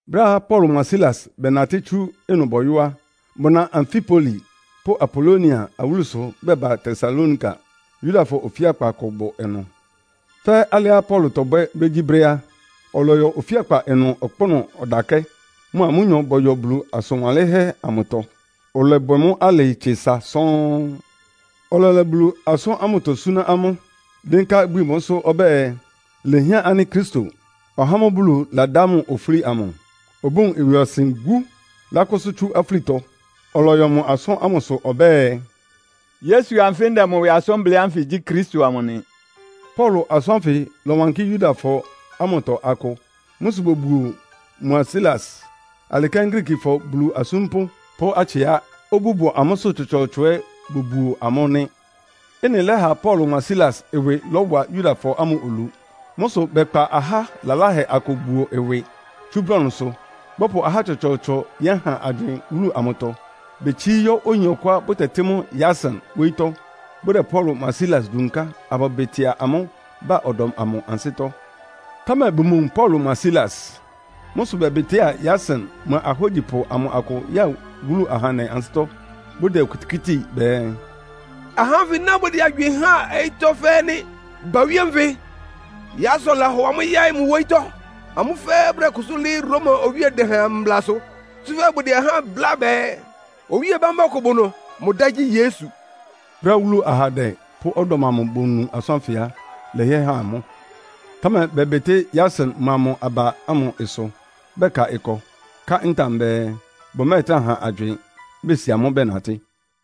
Brɛ́á Paulo mʋa Silas bɛnatɩ́ tsú ɩnʋ bɔyɔ́ á, bʋna Amfipoli pʋ́ Apolonia awúlusʋ bɛba Tesalonika. Yudafɔ ofíakpa kʋ bʋ ɩnʋ. Fɛ́ alɩá Paulo tɔbwɛ́ brégyíbrɛ́ á, ɔlɔyɔ ofíakpa ɩnʋ ɔkpʋ́nʋ́ ɔdakɛ́, mʋa amʋ́nyɔ bɔyɔ Bulu asʋn wanlɩ́nhɛ́ amʋtɔ. Ɔlɔbwɛ mʋ́ alɩ tse sa sɔ́ɔ́n. Ɔlɛlɛ Bulu asʋ́n ámʋtɔ súná amʋ́, dɩ́nká ibwi mʋ́sʋ́ ɔbɛ́ɛ, “Ilehián ánɩ́ Kristo, (ɔhá ámʋ́ʋ́ Bulu ladá mʋ ofúli amʋ), obówun ɩwɩɔsɩn wú, lákʋ́sʋ́ tsú afúlitɔ.” Ɔlɔyɔ mʋ asʋ́n ámʋsʋ ɔbɛ́ɛ, “Yesu anfɩ́ ndɛ mʋ ɩwɩ asʋ́n blɩ́ ánfɩ gyí Kristo amʋ nɩ.” Paulo asʋ́n ánfɩ lɔwankɩ́ Yudafɔ ámʋtɔ akʋ. Mʋ́ sʋ bobuo mʋa Silas. Alɩ kɛ́n Griikifɔ Bulu asúmpʋ́ pʋ́ atsɩá obú bʋ amʋ́sʋ́ tsɔtsɔɔtsɔ ɛ́ bobuo amʋ́ nɩ́. Ɩ́nɩ lɛ́ha Paulo mʋa Silas ɩwɩ lɔ́wa Yudafɔ ámʋ olu. Mʋ́ sʋ bɛkpa aha laláhɛ akʋ buo ɩwɩ tsú brɔnʋsʋ, bɔpʋ ahá tsɔtsɔɔtsɔ yɛ́han agywɩɩn wúlu amʋtɔ. Betsií yɔ́ oyin ɔkʋá bʋtɛtɩ́ mʋ Yason wóyítɔ́, bʋdɛ Paulo mʋa Silas dunká abʋbɩtɩa amʋ́ ba ɔdɔm amʋ ansɩ́tɔ́. Támɛ bʋmowun Paulo mʋa Silas. Mʋ́ sʋ bɛbɩtɩ́a Yason mʋa ahógyipʋ amʋ akʋ ya wúlu ahandɛ ansɩ́tɔ́, bʋdɛ okitikíti bɛɛ, “Ahá ánfɩ ná bʋdɛ agywɩɩn háan ɔyɩ́tɔ́ fɛ́ɛ́ nɩ́. Bawíé nfɩ, Yason lahɔ amʋ́ yáɩ́ mʋ wóyítɔ́. Amʋ́ fɛ́ɛ́ bʋdɛkʋsʋ́ lɩ́ɩ́ Roma Owíe Dɛhɛn mblasʋ. Tsúfɛ́ bʋdɛ ahá bláa bɛɛ, owíe bambá ɔkʋ bʋ ɩnʋ, mʋ dá gyí Yesu.” Brɛ́á wúlu ahandɛ pʋ́ ɔdɔm amʋ bonu asʋ́n ánfɩ á, ɩlɛhɩɛ han amʋ́. Támɛ bɛbɩtɩ́ Yason mʋa mʋ aba ámʋ ɩsʋ, bɛka ɩkɔ, ká ntam bɛɛ bʋmɛ́ɛtrá han agywɩɩn, besi amʋ́ bɛnatɩ́.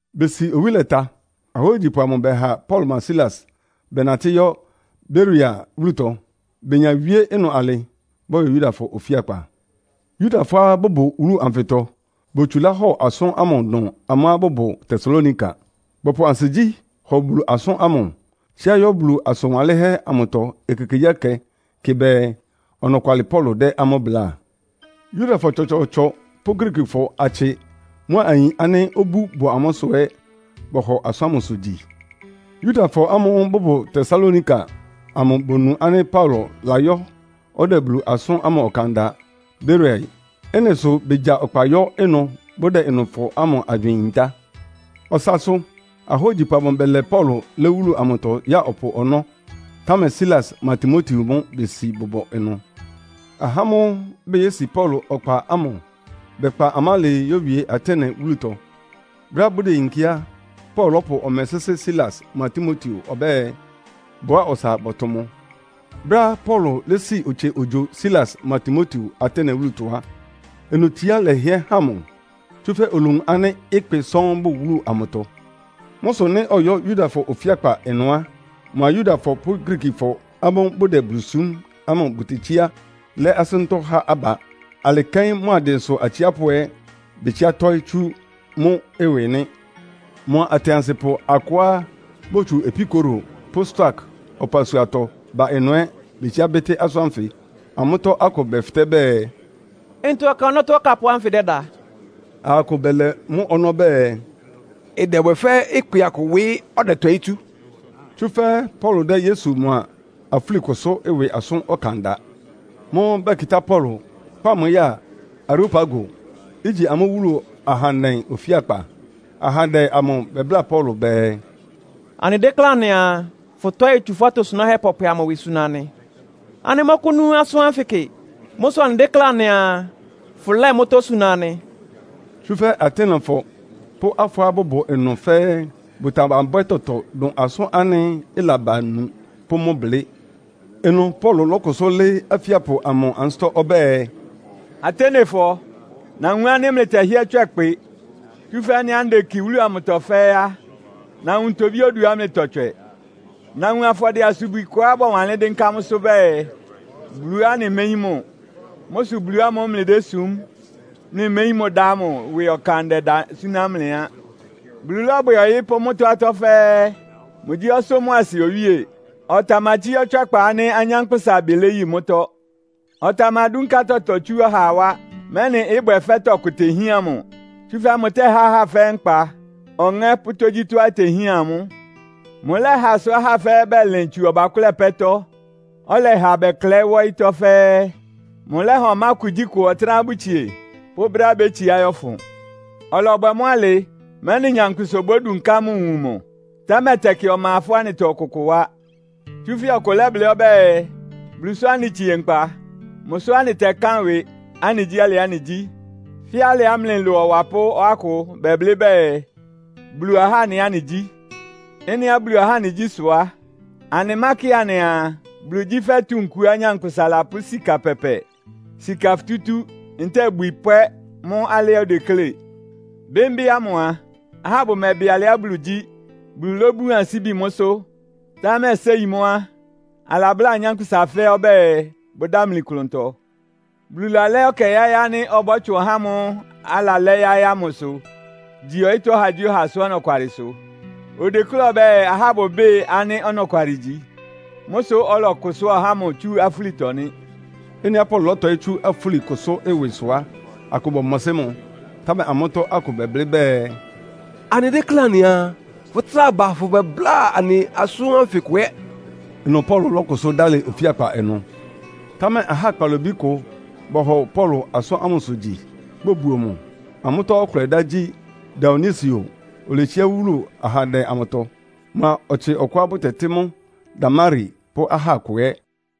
Besi owí lɛta, ahógyipʋ amʋ bɛha Paulo mʋa Silas bɛnatɩ́ yɔ́ Beroia wúlutɔ. Benya wíé ɩnʋ alɩ, bɔyɔ Yudafɔ ofíakpa. Yudafɔá bʋbʋ wúlu anfɩtɔ botsulá hɔ asʋ́n ámʋ dʋn amʋ́á bʋbʋ Tesalonika. Bɔpʋ ansigyí hɔ Bulu asʋ́n ámʋ, tsíá yɔ́ Bulu asʋn wanlɩ́nhɛ́ amʋtɔ ekekegyíɛkɛ kɩ bɛɛ, ɔnɔkwalɩ Paulo dɛ́ amʋ́ bláa. Yudafɔ tsɔtsɔɔtsɔ pʋ́ Griikifɔ atsɩ mʋ́a ayin ánɩ́ obú bʋ amʋ́sʋ́ ɛ́ bɔhɔ asʋ́n ámʋsʋ gyi. Yudafɔ ámʋ́ʋ́ bʋbʋ Tesalonika amʋ bonu ánɩ́ Paulo layɔ́ ɔdɛ Bulu asʋ́n ámʋ ɔkan da Beroia. Ɩ́nɩ sʋ begya ɔkpa yɔ́ ɩnʋ bʋdɛ ɩnʋfɔ ámʋ agywɩɩn yintá. Ɔsasʋ, ahógyipʋ amʋ bɛlɛ Paulo lɛ́ wúlu amʋtɔ ya ɔpʋ ɔnɔ́, támɛ Silas mʋa Timoteo mʋ́ besi bʋbʋ ɩnʋ. Ahá ámʋ́ʋ́ beyési Paulo ɔkpa ámʋ bɛkpa mʋ alɩɩ yówie Atene wúlutɔ. Brɛ́á bʋdeyinkí á, Paulo lɔ́pʋ ɔmɛ sɩ́sɩ́ Silas mʋa Timoteo ɔbɛ́ɛ, bʋwáa ɔsa bɔtʋ mʋ. Brɛ́á Paulo lési otsie ogyo Silas mʋa Timoteo Atene wúlutɔ á, ɩnʋ tsiá lɛhɩɛ han mʋ. Tsúfɛ́ olowun ánɩ́ ɩkpɩ sɔ́ɔ́n bʋ wúlu amʋtɔ. Mʋ́ sʋ nɩ́ ɔyɔ́ Yudafɔ ofíakpa ɩnʋ á, mʋa Yudafɔ pʋ́ Griikifɔ ámʋ́ʋ́ bʋdɛ Bulu súm ámʋ bʋtetsíá lɛ́ asʋ́ntɔ́ há aba. Alɩ kɛ́n mʋa dɩnsʋ atsiápʋ́ ɛ́ betsiá tɔ́ɩ́ tsú mʋ́ ɩwɩ nɩ́. Mʋa atɩansɩpʋ akʋá botsu Epikuro pʋ́ Stoak ɔpasuatɔ ba ɩnʋ ɛ́ betsiá bɩ́tɩ́ asʋ́n ánfɩ. Amʋ́tɔ́ akʋ bɛfɩtɛ́ bɛɛ, “Ntɔ ɔkan ɔnɔ́tɔ́ ɔkapʋ́ ánfɩ dɛ́da?” Aha akʋ bɛlɛ mʋ́ ɔnɔ́ bɛɛ, “Ɩdɛbwɛ fɛ́ ɩkpɩ akʋ ɩwɩ ɔdɛtɔɩ́ tsú.” Tsúfɛ́ Paulo dɛ́ Yesu mʋa afúlikʋsʋ́ ɩwɩ asʋ́n ɔkan da. Mʋ́ʋ́ bɛkɩtá Paulo, kpá mʋ ya Areopago, igyi amʋ́ wúlu ahandɛ ofíakpa. Ahandɛ amʋ bɛbláa Paulo bɛɛ, “Anɩdéklé anɩaa, fʋtɔ́ɩ tsu fʋ́ atosunáhɛ́ pɔpwɛ amʋ ɩwɩ suna anɩ. Anɩmɔ́kʋ́nú asʋ́n ánfɩ kɩ. Mʋ́ sʋ anɩdéklé anɩaa, fʋlɛ́ɛ mʋ́tɔ́ suna anɩ.” Tsúfɛ́ Atenefɔ pʋ́ afɔɔ́á bʋbʋ ɩnʋ fɛ́ɛ́ bʋtamabwɛ́ tɔtɔ dʋn asʋ́n ánɩ́ ɩlaba nu pʋ́ mʋ́ blɩ́. Ɩnʋ Paulo lɔ́kʋsʋ́ lɩ́ɩ́ afíapʋ amʋ ansɩ́tɔ́ ɔbɛ́ɛ, “Atenefɔ, nawun ánɩ́ mlɩtɛhɩ́ɛ́ tswɛ ɩkpɩ. Tsúfɛ́ ɩ́nɩá ndeki wúlu anfɩtɔ fɛ́ɛ́ á, nawun ntobí oduá mlɩtɔtswɛ. Nawun afɔdɩɛ-asubwi kʋá bɔwanlɩ́n dɩ́nká mʋ́sʋ́ bɛɛ, ‘Buluá Anɩméyín Mʋ.’ Mʋ́ sʋ Bulu ámʋ́ʋ́ mlɩdésum, mlɩméyín mʋ dá ámʋ ɩwɩ ɔkan ndɛda súná mlɩ á. Bulu lɔ́bwɛ ɔyɩ́ pʋ́ mʋ́tɔ́ atɔ́ fɛ́ɛ́. Mʋgyí ɔsʋ́ mʋ́a asɩ Owíe. Ɔtamatsíá ɔtswɛ́kpa ánɩ́ anyánkpʋ́sa ɩbɩ léyi mʋ́tɔ́. Ɔtamadúnká tɔtɔ tsú ɔhaa wá, mɛ́nɩ ɩbwɛ fɛ́ tɔkʋ tehían mʋ. Tsúfɛ́ mʋtɛ́há ahá fɛ́ɛ́ nkpa, ɔŋɛ́ pʋ́ tógyítɔ́á itehían amʋ́. Mʋlɛ́ha sʋ ahá fɛ́ɛ́ bɛlɩn tsu ɔbakʋ́lɛ pɛ́tɔ́, ɔlɛha bɛklɛɩ́ wá ɔyɩ́tɔ́ fɛ́ɛ́. Mʋlɛ́ha ɔmá kugyíkʋ ɔtɩ́nɛ́á bʋtsie pʋ́ brɛ́á bétsiá yɔ́fʋn. Ɔlɔbwɛ mʋ́ alɩ, mɛ́nɩ nyankpʋsa obódunká mʋ wun mʋ. Támɛ tɛkɩ ɔma ɩfɔ́ anɩtɔ ɔkʋkʋ wá. Tsúfɛ́ ɔkʋ lɛ́blɩ́ ɔbɛ́ɛ, ‘Bulu sʋ anɩtsie nkpa. Mʋ sʋ́ anɩtɛkán ɩwɩ, anɩgyí alɩá anɩgyí.’ Fɛ́ alɩá mlɩ ɩlʋ awapʋ́ akʋ bɛblɩ́ bɛɛ, ‘Bulu ahá anɩ ɛ́ anɩgyí.’ “Ɩ́nɩá Bulu ahá anɩgyí sʋ á, anɩmákɩ anɩaa, Bulu gyí fɛ́ tunkuá nyankpʋsa lapʋ́ sika pɛpɛ, sika futútú ntɛ́ɛ ibwi pwɛ́ mʋ́ alɩá odeklé. Bɩ́mbɩ́ ámʋ a, ahá bʋmɛbɩ alɩá Bulu gyí. Bulu lóbun ansíbi mʋ́sʋ́, támɛ séi mʋ́ á, alabláa anyánkpʋ́sa fɛ́ɛ́ ɔbɛ́ɛ, bʋdámli klʋntɔ. Bulu lalɛ́ ɛkɛ yáɩ́ ánɩ́ ɔbɔ́tsʋn ɔhá ámʋ́ʋ́ alalɛ́ yáɩ́ ámʋsʋ gyi ɔyɩ́tɔ́ ɔhagyíɔha asʋ́n ɔnɔkwalɩsʋ. Odeklé ɔbɛ́ɛ ahá bʋbɩ́ɩ ánɩ́ ɔnɔkwalɩ igyi. Mʋ́ sʋ́ ɔlɔkʋsʋ́a ɔhá ámʋ tsú afúlitɔ nɩ́.” Ɩ́nɩá Paulo lɔ́tɔɩ́ tsú afúlikʋsʋ́ ɩwɩ sʋ á, akʋ bɔmɔsɩ́ mʋ. Támɛ amʋ́tɔ́ akʋ bɛblɩ́ bɛɛ, “Anɩdéklé anɩaa, fʋtráa ba afʋbɛbláa anɩ asʋ́n ánfɩ kʋ ɛ́.” Ɩnʋ Paulo lɔ́kʋsʋ́ dálɩ ofíakpa ɩnʋ. Támɛ ahá kpalobí kʋ bɔhɔ Paulo asʋ́n ámʋsʋ gyi, bobuo mʋ. Amʋ́tɔ́ ɔkʋlɛ dá gyí Dionisio, oletsiá wúlu ahandɛ amʋtɔ. Mʋa ɔtsɩ ɔkʋá bʋtɛtɩ́ mʋ Damari pʋ́ aha akʋ ɛ́.